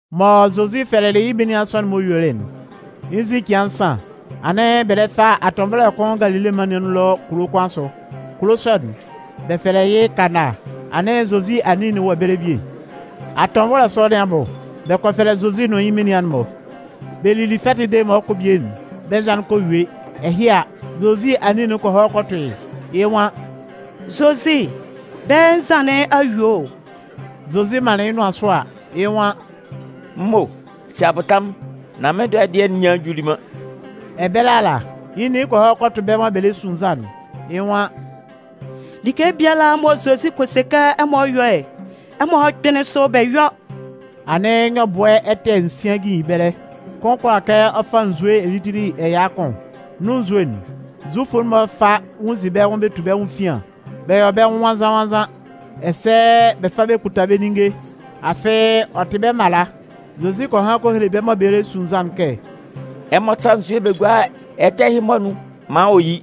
Mɔ Zozi fɛlɛlɩ yɩ́ menian sɔ'n-mɔ yuelɩ'n, yɩ́ nzin cɩan nsan, anɩn bɛ lɛ fa atɔnvɔlɛ kʋn Galile mân nɩn anun ɛlɔ kulo kʋn asʋ. Kulo sɔ'n, bɛ fɛlɛ yɩ́ Kana. Anɩn Zozi anin'n wɔ ɛbɛlɛ bie. Atɔnvɔlɛ sɔ nɩn abʋ, bɛ kɔ fɛlɛ Zozi nʋn yɩ́ menian'n-mɔ. Bɛ lili fɛtɩ'n dede mɔ ɔ 'kɔ bie'n, bɛ́ nzan'n kɔ yue. Ɛhɩ a, Zozi anin'n kɔ hɔ kɔ tʋ yɩ́, yɩ́ nwan: “Zozi, bɛ́ nzan nɩn a yue o.” Zozi manlɩn yɩ́ nʋan sʋ a, yɩ́ nwan: “M mo, si abʋtamʋn, nán mɩ́n dɔɛ dɩɛ'n nyan juli man.” Ɛbɛlɛ ala, yɩ́ nin kɔ hɔ kɔ tʋ bɛ́ mɔ bɛ lɛ su nzan'n, yɩ́ nwan: “Like biala mɔ Zozi kɔ se kɛ ɛmɔ yɔ́'n, ɛmɔ kpɩ́nlɩn sʋ bɛ yɔ́.” Anɩn, nyɔbʋɛ ɛ́tɛ́ nsian jijin ɛbɛlɛ, kʋn kʋala kɛ ɔ fa nzue elitili ɛya kʋn. Nun nzue'n, Zufʋ'n-mɔ fa nwunnzin bɛ́ sa bɛ tu bɛ́ nwʋn efian bɛ yɔ bɛ́ nwʋn nwannzan-nwannzan, ɛsɛ bɛ fa bɛ kputa bɛ́ ninnge. Afɩ, ɔ tɩ bɛ́ mala. Zozi kɔ han kɔ hele bɛ́ mɔ bɛ lɛ su nzan'n kɛ: “Ɛmɔ sá nzue bɛ gúa ɛ́tɛ́ ɛhɩ-mɔ anun maan ɔ yí.”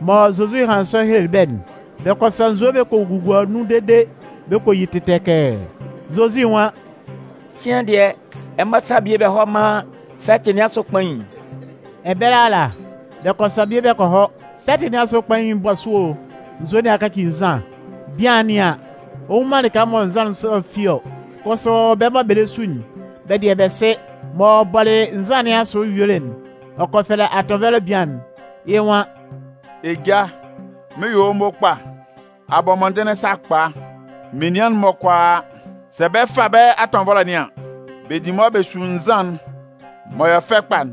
Mɔ Zozi hanlɩn sɔ helelɩ bɛ́'n, bɛ kɔ sa nzue bɛ kɔ gugua nun dede bɛ kɔ yi tɩtɛkɛɛ. Zozi nwan: “Sian dɩɛ, ɛmɔ sá bie bɛ hɔ́ mán fɛtɩ nɩn asʋ kpain'n.” Ɛbɛlɛ ala, bɛ kɔ sa bie bɛ kɔ hɔ. Fɛtɩ nɩn asʋ kpain'n 'bɔ sʋ o, nzue nɩn a kaci nzan. Bian'n nɩan an, ɔ nnwun man lɩka mɔ nzan sɔ'n fi ɔ, kʋsʋ bɛ́ mɔ bɛ lɛ su'n, bɛ dɩɛ, bɛ sɩ. M'ɔ bɔlɩ nzan nɩn asʋ yuelɩ'n, ɔ kɔ fɛlɛ atɔnvɔlɛ bian'n, yɩ́ nwan: “Eja, mɩn 'yɔ wɔ́ mo kpa! A bɔ mɔndɩnlɩn sakpa! Menian'n-mɔ kʋalaa, sɛ bɛ 'fa bɛ́ atɔnvɔlɛ nɩn an, bɛ di mʋa bɛ su nzan'n m'ɔ yɔ fɛ kpa'n.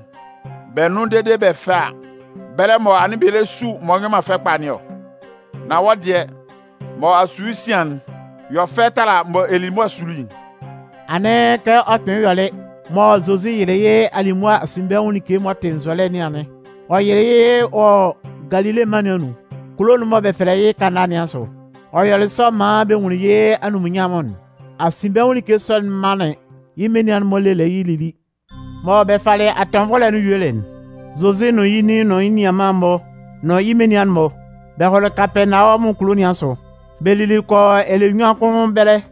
Bɛ nʋn dede bɛ fɛ a, bɛlɛ mɔ anɩn bɛ lɛ su m'ɔ nyɔ man fɛ kpa nɩn ɔ. Nan wɔ́ dɩɛ, mɔ a su yɩ́ sian'n yɔ fɛ tala mɔ ɛ lili mʋa suli'n.” Anɩn kɛ ɔ kpɩnlɩn yɔlɩ mɔ Zozi yɩlɩ alimʋa asinbɛnwʋn like m'ɔ tɩ nzɔlɛ nɩn anɩn. Ɔ yɩlɩ yɩ́ wɔ Galile mân nɩn anun, kulo'n mɔ bɛ fɛlɛ yɩ́ Kana nɩn asʋ. Ɔ yɔlɩ sɔ maan bɛ nwunlin yɩ́ anunminnyanmʋn'n. Asinbɛnwʋn like sɔ'n manlɩn yɩ́ menian'n-mɔ lelɩ yɩ́ lili. Mɔ bɛ falɩ atɔnvɔlɛ'n yuelɩ'n, Zozi nʋn yɩ́ nin nʋn yɩ́ nianman'n-mɔ nʋn yɩ́ menian'n-mɔ, bɛ hɔlɩ Kapɛɛnawɔmʋn kulo nɩn asʋ, bɛ lili kɔ yɔ ɛlɛ nnyuan kʋn ɛbɛlɛ.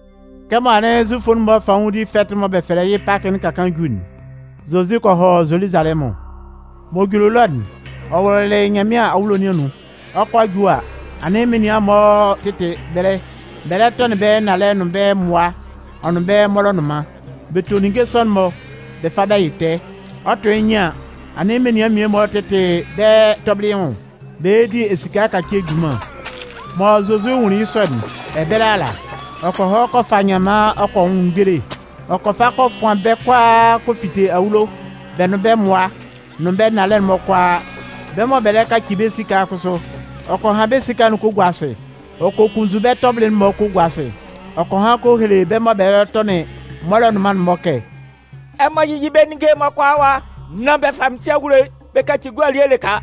Kɛmɔ anɩn Zufʋ'n-mɔ fanwʋndi fɛtɩ'n mɔ bɛ fɛlɛ yɩ́ Pakɩ'n ka kaan ju'n, Zozi kɔ hɔ Zoluzalɛmʋn. M'ɔ juli ɛlɔ'n, ɔ wʋlʋlɩ Nyanmɩan awulo nɩn anun, ɔ 'kɔ a ju a, anɩn menian mmie-mɔ tɩtɩ ɛbɛlɛ, bɛ lɛ tɔnɩn bɛ́ nnalɛ nʋn bɛ́ mmʋa ɔ nʋn bɛ́ mɔlɔnʋnman. (Bɛ to ninnge sɔ'n-mɔ bɛ fa bɛ yɩ tɛɛ.) Ɔ 'tʋ yɩ́ nyɩn an, anɩn menian mmie-mɔ tɩtɩ bɛ́ tɔbɩlɩ nwʋn, bɛ lɛ di esika ɛkacie junman. Mɔ Zozi nwunlin yɩ́ sɔ'n, ɛbɛlɛ ala, ɔ kɔ hɔ kɔ fa nyanman ɔ kɔ nwʋn mgbele. Ɔ kɔ fa kɔ fʋan bɛ́ kʋalaa kɔ fite awulo, bɛ́ nʋn bɛ́ mmʋa, nʋn bɛ́ nnalɛ'n-mɔ kʋalaa. Bɛ́ mɔ bɛ lɛ kaci bɛ́ esika'n kʋsʋ, ɔ kɔ han bɛ́ esika'n-mɔ kɔ gua asɩ, ɔ kɔ kunnzun bɛ́ tɔbɩlɩ'n-mɔ kɔ gua asɩ. Ɔ kɔ han kɔ hele bɛ́ mɔ bɛ lɛ tɔnɩn mɔlɔnʋnman'n-mɔ kɛ: “Ɛmɔ yɩ́yɩ bɛ́ ninnge'n-mɔ kʋalaa ɛwa, nán bɛ fa mɩ́n Sɩ awulo'n bɛ kaci gua elie lɩka.”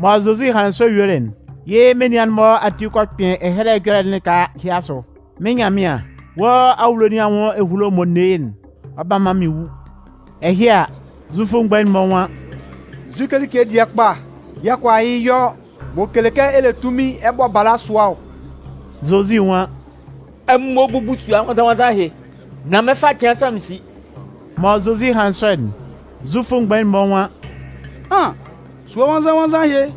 Mɔ Zozi hanlɩn ɛjɔlɛ sɔ'n yuelɩ'n, yɩ́ menian'n-mɔ ati kɔ kpɩn Ɛhɛlɛ Ɛjɔlɛ'n lɩka ɛhɩ asʋ: Mɩ́n Nyanmɩan, wɔ́ awulo nɩn anwʋn ehulo mɔ n ne yɩ́'n, ɔ 'ba man mɩn wu. Ɛhɩ a, Zufʋ mgbain'n-mɔ nwan: “Nzu like dɩɛ kpa yɛ̂ ɛ kʋala yɩ́ yɔ m'ɔ kele kɛ ɛ le tunmin ɛ bɔ bala sʋa ɔ?” Zozi nwan: “Ɛmɔ búbu sua nwannzan-nwannzan ɛhɩ, nan mɩn 'fa cɩan nsan mɩn si.” Mɔ Zozi hanlɩn sɔ'n, Zufʋ mgbain'n-mɔ nwan: “An! Sua Nwannzan-nwannzan ɛhɩ,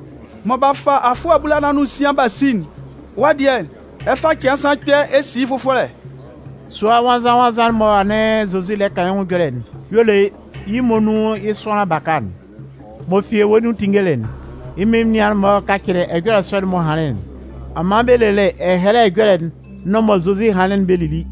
mɔ b'a fa afʋɛ abulanan nʋn nsian b'a si'n, wɔ́ dɩɛ, ɛ 'fa cɩan nsan kpɛ̂ ɛ si yɩ́ fʋfɔlɛ?” Sua nwannzan-nwannzan'n mɔ anɩn Zozi lɛ kan yɩ́ ɛjɔlɛ'n y'ɔ le yɩ́ muonun yɩ́ sʋanlan baka'n. M'ɔ fi ewue nun tinngelɩ'n, yɩ́ menian'n-mɔ kacɩlɩ ɛjɔlɛ sɔ'n m'ɔ hanlɩn'n. Ɔ man bɛ lelɩ Ɛhɛlɛ Ɛjɔlɛ'n nʋn mɔ Zozi hanlɩn'n bɛ lili.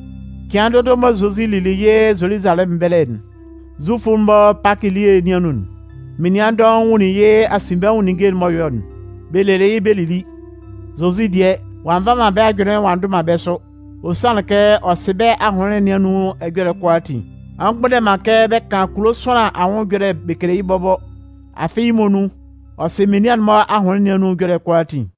Cɩan dʋdʋ mɔ Zozi lili yɩ́ Zoluzalɛmʋn ɛbɛlɛ Zufʋ'n-mɔ Pakɩ elie nɩn anun'n, menian dɔʋn nwunlin yɩ́ asinbɛnwʋn ninnge'n m'ɔ yɔ'n, bɛ lelɩ yɩ́ bɛ lili. Zozi dɩɛ, ɔ'a nva man yɩ́ ajʋnlɩn ɔ'a ndʋ man bɛ́ sʋ, ɔ sanlɩn kɛ ɔ sɩ bɛ́ ahʋnlɩn nɩn anun ɛjɔlɛ'n kʋalaatin. Ɔ mgbʋnndɛ man kɛ bɛ kan kulo sʋanlan anwʋn ɛjɔlɛ bɛ kele yɩ́ bɔbɔ, afɩ yɩ́ muonun, ɔ sɩ menian'n-mɔ ahʋnlɩn nɩn anun ɛjɔlɛ'n kʋalaatin.